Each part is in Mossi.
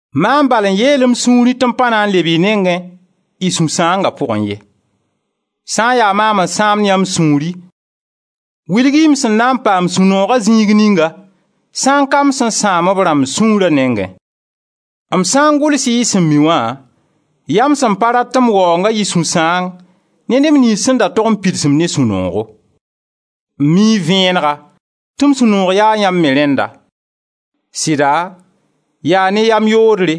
Maam bal n yeel m sũurẽ tɩ m pa na n leb y nengẽ y sũ-sãanga pʋgẽ ye. Sã n ya maam n sãamd yãmb sũuri wilg-y m sẽn na n paam sũ-nooga zĩig ninga sã n ka m sẽn sãam b rãmb sũurã nengẽ? M sã n gʋls-y y sẽn mi wã, yaa m sẽn pa rat tɩ m waoonga yɩ sũ-sãang ne neb niyns sẽn da tog n pids-m ne sũ-noogo; m mii vẽenega tɩ m sũ-noog yaa yãmb me rẽnda. Sɩda, yaa ne yam-yoodre,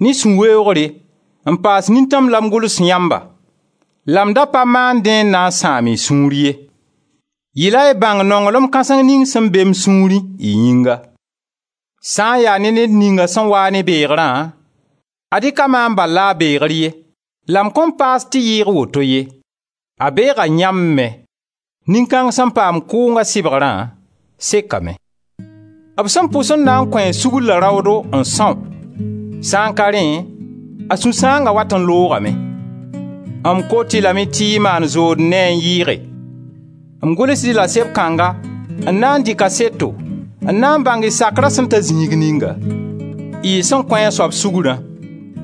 ne sũ-weoogre, n paas nintãm la m gʋls yãmba la m da pa maan dẽ n na n sãam y sũur ye; yɩla y bãng nonglem kãseng ning sẽn be m sũurẽ y yĩnga. Sã n ya ne ned ninga sẽn waa ne beegrã, ad-y ka maam bal la a beegr ye — la m kõn paas tɩ yɩɩg woto ye — a beega yãmb me. Nin-kãng sẽn paam kʋʋnga sɩbgrã, sekame. B sẽn pʋs n na n kõ-a sugr la raoodo n são, sã n ka rẽ a sũ-sãanga wat n loogame. M kot-y lame tɩ y maan zood ne a n yɩɩge. M gʋlsd-y la seb kãngã n na n dɩ kaseto, n na n bãng y sakra sẽn ta zĩig ninga. Y sẽn kõ a soab sugrã,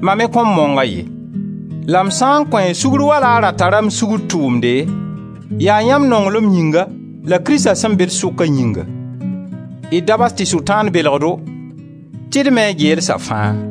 mam me kõn mong-a ye; la m sã n kõ-a sugr wala a ra tara m sugr tʋʋmde, yaa yãmb nonglem yĩnga la Krista sẽn be d sʋkã yĩnga. D da bas tɩ Sʋtãan belg-do tɩ d mi a geelsa fãa.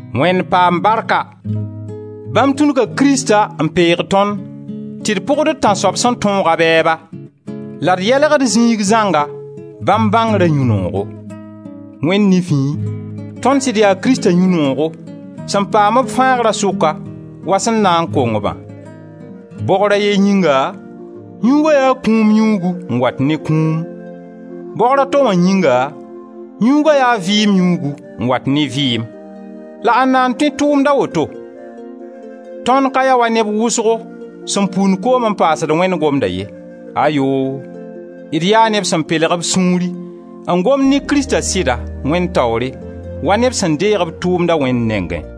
Wẽnd paam barka! Bãmb tũnuga Krista n peeg tõnd tɩ d pʋgd d Tãnsoab sẽn tõog a bɛɛba la d yelgd zĩig zãnga bãmb bãngrã yũ-noogo. Wẽnd nifẽ, tõnd sɩd yaa Krista yũ-noogo, sẽn paam b fãagra sʋka wa sẽn na n kong-bã. Bogr a ye yĩnga yũuga yaa kũum yũugu n wat ne kũum. Bogra to wã yĩnga, yũuga yaa vɩɩm yũugu n wat ne vɩɩm. La ãnda n tõe tʋʋmd a woto? Tõnd ka ya wa neb wʋsgo sẽn pund koom n paasd Wẽnd gomda ye, ayoo! D yaa neb sẽn pelg b sũuri, n gomd ne Krista sɩda, Wẽnd taoore, wa neb sẽn deeg b tʋʋmda Wẽnd nengẽ.